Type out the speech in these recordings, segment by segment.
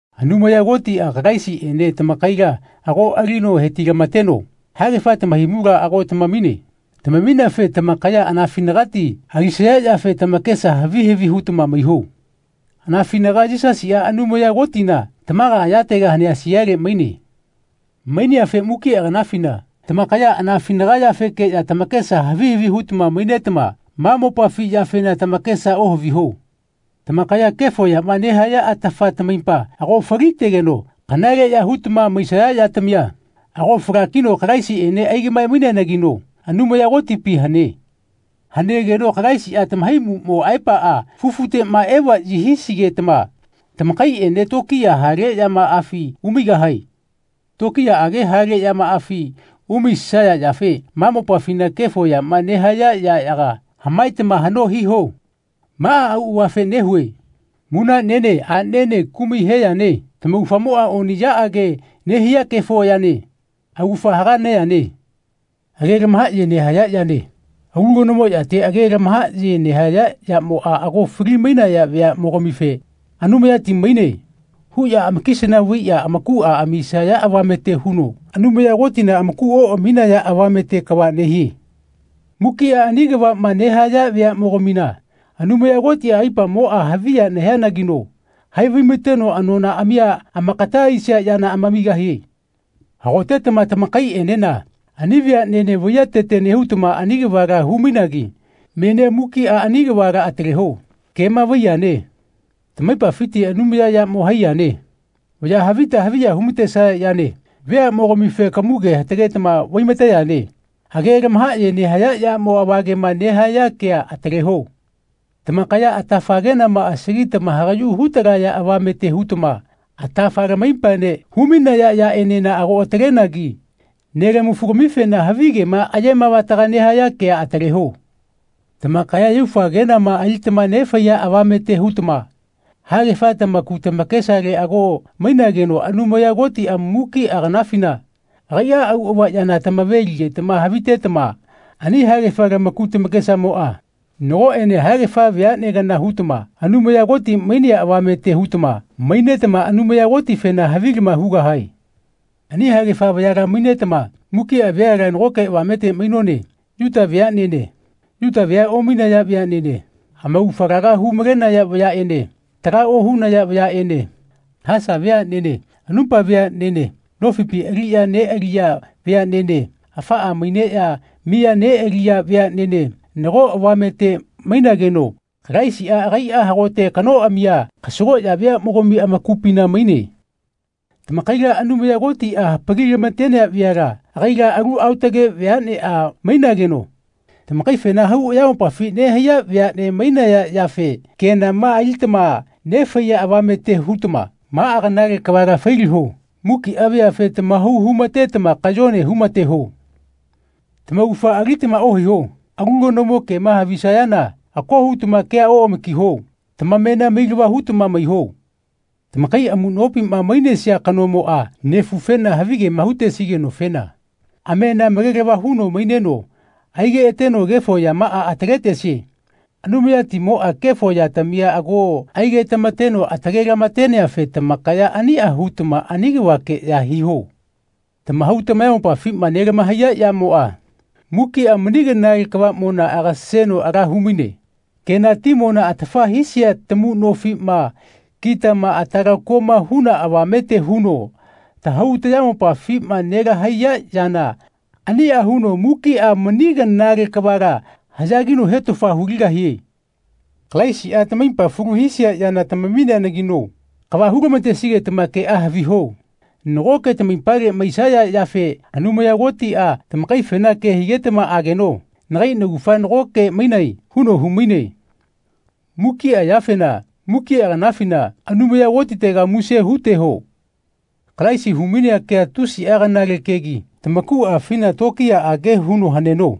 Anumaya Kotiꞌa Kalaisiꞌene tamakaila ago alino hetilamateno haegafa tamahaimula ago tamamine. Tamamineafe tamakaya anafinagati alisaya yafe tamakesa havi havi hutama maiho. Anafinaga Yisasiꞌa Anumaya Kotina tamaga ayatega hanea siale maine. Maineafe mukiꞌa kanafina tamakaya anafinaga yafekeꞌya tamakesa havi havi hutama mainetama ma mopafi yafena tamakesa ohaviho. Tamakaya kefo yama nehaya atafa tamaipa ago falitegeno kanaleꞌya hutama maisaya yatamia ago falakino Kalaisiꞌene aigaꞌmae-maineanagino Anumaya Kotipi hane. Hanegeno Kalaisiꞌa tamahaimuꞌmo aepaꞌa fufuteꞌma evaꞌyi hisigetama tamakaiꞌene tokiya hale yamaꞌafi umaigahae. Tokiyaꞌage hale yamaꞌafi umaisaya yafe ma mopafi kefo yama nehaya yaꞌyaga hamaetama haꞌno hiho. Maꞌa auꞌavafe nehue munaꞌnene aꞌnene kumai he yane. Tamaugafamoꞌa oniꞌyaꞌage nehia kefo yane. Augafa haga neyane. Age lamahaꞌye nehaya yane. Alu kanomo yate age lamahaꞌye nehaya yamoꞌa ago fali-mainaya veaꞌmogamife “Anumayati maine.” huꞌya amakisana vaiꞌya amaku amisaya avamete huno Anumaya Kotina amaku oꞌaminaya avamete kava nehie. Mukiꞌa ani kavaꞌma nehaya veaꞌmogamina Anumaya Kotiꞌa aipamoꞌa haviya nehianagino haivaimateno anonaꞌamia amakata aisia yana amamigahie. Hagotetama tamakaiꞌenena ani veaꞌnene vaiyatete nehutama ani kavala hu-mainagi menia mukiꞌa ani kavala ataleho. Kema vaiyane. Tamaipafiti anumayayamo hai yane. Vaya havita haviya humatesaya yane. Veaꞌmogamife kamuge hatagetama vaimate yane. Age lamahaꞌye nehaya yamo avagema nehaya kea ataleho. Tamakaya atafa kenama asagitama hagaꞌyu hutalaya avamete hutama atafa lamaipaene humainaya yaꞌenena ago atalenagi nelamafu-gamifena havigema ayemavataga nehaya kea ataleho. Tamakaya yaufa kenama alitama nefaiya avamete hutama haegafa tamaku tamakesale ago mainageno Anumaya Kotiꞌa mukiꞌa kanafina agaiꞌa auꞌava yana tamave-ligetama havitetama ani haegafa lamaku tamakesamoꞌa nagoꞌene haegafa veaꞌne kana hutama Anumaya Koti mainea avamete hutama mainetama Anumaya Kotifena havilama hugahae. Ani haegafa vayala mainetama mukiꞌa veala nagoke avamete mainone Yuta veaꞌnene Yuta vea omainaya veaꞌnene, amaugafa laga hu-malenaya vayaꞌene taga ohunaya vayaꞌene haesa veaꞌnene anupa veaꞌnene nofipi aliꞌya neꞌaliya veaꞌnene afaꞌa maineꞌya miya neꞌaliya veaꞌnene nago avamete mainageno Kalaisiꞌa agaiꞌa hagote kanoꞌamia kasagoꞌya veaꞌmogami amakupina maine. Tamakaila Anumaya Kotiꞌa hapali-lamatenea veala agaila alu aotage veaꞌneꞌa mainageno tamakaifena hau ayamopafi nehaiya veaꞌne mainaya yafe kenama alitama nefaiya avamete hutama maꞌa kanale kavala failiho. Mukiꞌa veafe tamahau humatetama kayone humateho. Tamaugafa alitama ohaiho. Alu kanomo kema havisayana ako hutama kea oꞌamakiho. Tamamena mailava hutama maiho. Tamakai amuꞌnopima mainesia kanomoꞌa nefufena havigema hutesigenofena amena malelava huno maineno aigeꞌateno kefo yamaꞌa ataletesie. Anumayatimoꞌa kefo yatamia ago aigetamateno atalelamateneafe tamakaya aniꞌa hutama ani kavakeꞌya hiho. Tamahau tamayamopafima nelamahaiya yamoꞌa mukiꞌa mani kanale kavaꞌmona agaseno ala humaine. Kenatimona atafa hisia tamuꞌnofiꞌma kitama atalakoma huna avamete huno tahau tayamopafima nelahaiya yana aniꞌa huno mukiꞌa mani kanale kavala haꞌyagino hetofa huligahie. Kalaisiꞌa tamaipa falu hisia yana tamamineanagino kava hulamatesigetama keꞌa haviho. Nagoke tamaipale maisaya yafe Anumaya Kotiꞌa tamakaifena ke higetama ageno “Nagai naugafa nagoke mainae.” huno humaine. Mukiꞌa yafena mukiꞌa kanafina Anumaya Kotitega muse huteho. Kalaisi humainea kea tusiꞌa kanale kegi tamakuꞌafina tokiyaꞌage huno haneno.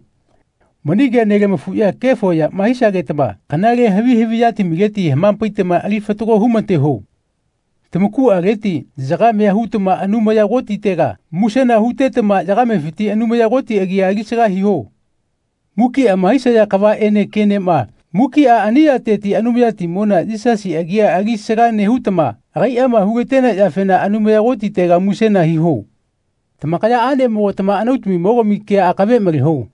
Mani kea nelamafuꞌya kefo yama hisagetama kanale havi haviꞌyatamileti hamapaitama ali fatago humateho. Tamakuꞌaleti yagamea hutama Anumaya Kotitega musena hutetama yagamefiti Anumaya Koti agia alisaga hiho. Mukiꞌama hisaya kavaꞌene kenema mukiꞌa ani yateti Anumayatimona Yisasi agia alisaga nehutama agaiꞌama hulatenea yafena Anumaya Kotitega musena hiho. Tamakaya aꞌnemogatama anautamimogami kea akave maleho.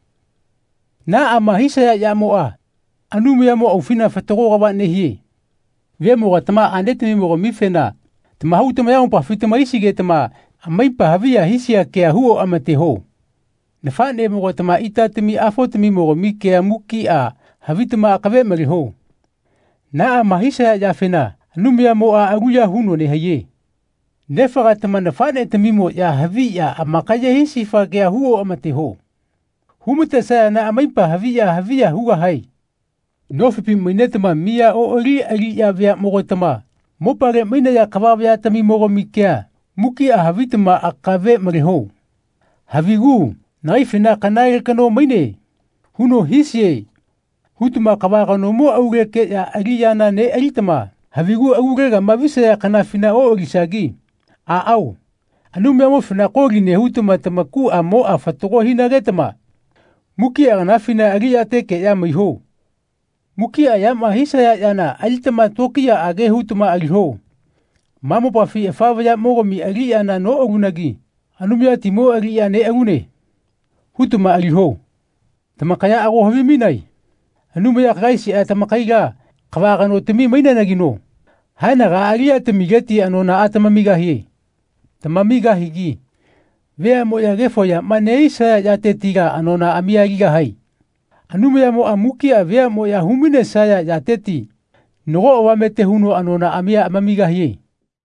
Naꞌama hisaya yamoꞌa Anumayamo aufina fatago kava nehie. Vemogatama aꞌnetamimo-gamifena tamahau tamayamopafi tamahaisigetama amaipa haviya hisia kea hu oꞌamateho. Nafaꞌnemogatama itatami-afotamimogami kea mukiꞌa havitama akave maleho. Naꞌama hisaya yafena Anumayamoꞌa aluya huno nehaiye. Nefagatama nafaꞌnetamimoꞌya haviꞌya amakaye hisifa kea hu oꞌamateho. Humatesayana amaipa haviꞌya haviya hugahae. Nofipi mainetama miya oꞌali aliꞌya veaꞌmogatama mopale mainaya kava vayatamimogami kea mukiꞌa havitama akave maleho. Havigu “Nagaifena ‘Kanale kano maine.’ huno hisie.” hutama kava kanomo aulekeꞌya aliꞌyana neꞌalitama havigu alulegama visaya kanafina oꞌalisagi aꞌao Anumayamofena koli nehutama tamakuꞌamoꞌa fatago hinagetama mukiꞌa kanafina aliꞌyatekeꞌya maiho. Mukiꞌa yama hisaya yana alitama tokiyaꞌage hutama aliho. “Ma mopafi afa vayaꞌmogami aliꞌyana noꞌalunagi Anumayatimo aliꞌya neꞌalune.” hutama aliho. Tamakaya ago havimainae Anumaya Kalaisiꞌa tamakaila kava kanotami maineanagino haenagaꞌa aliꞌyatamileti anonaꞌa tamamigahie. Tamamigahigi veaꞌmoꞌya kefo yama nehisaya yatetila anonaꞌamia aligahae. Anumayamoꞌa mukiꞌa veaꞌmoꞌya humainesaya yateti nago avamete huno anonaꞌamia amamigahie.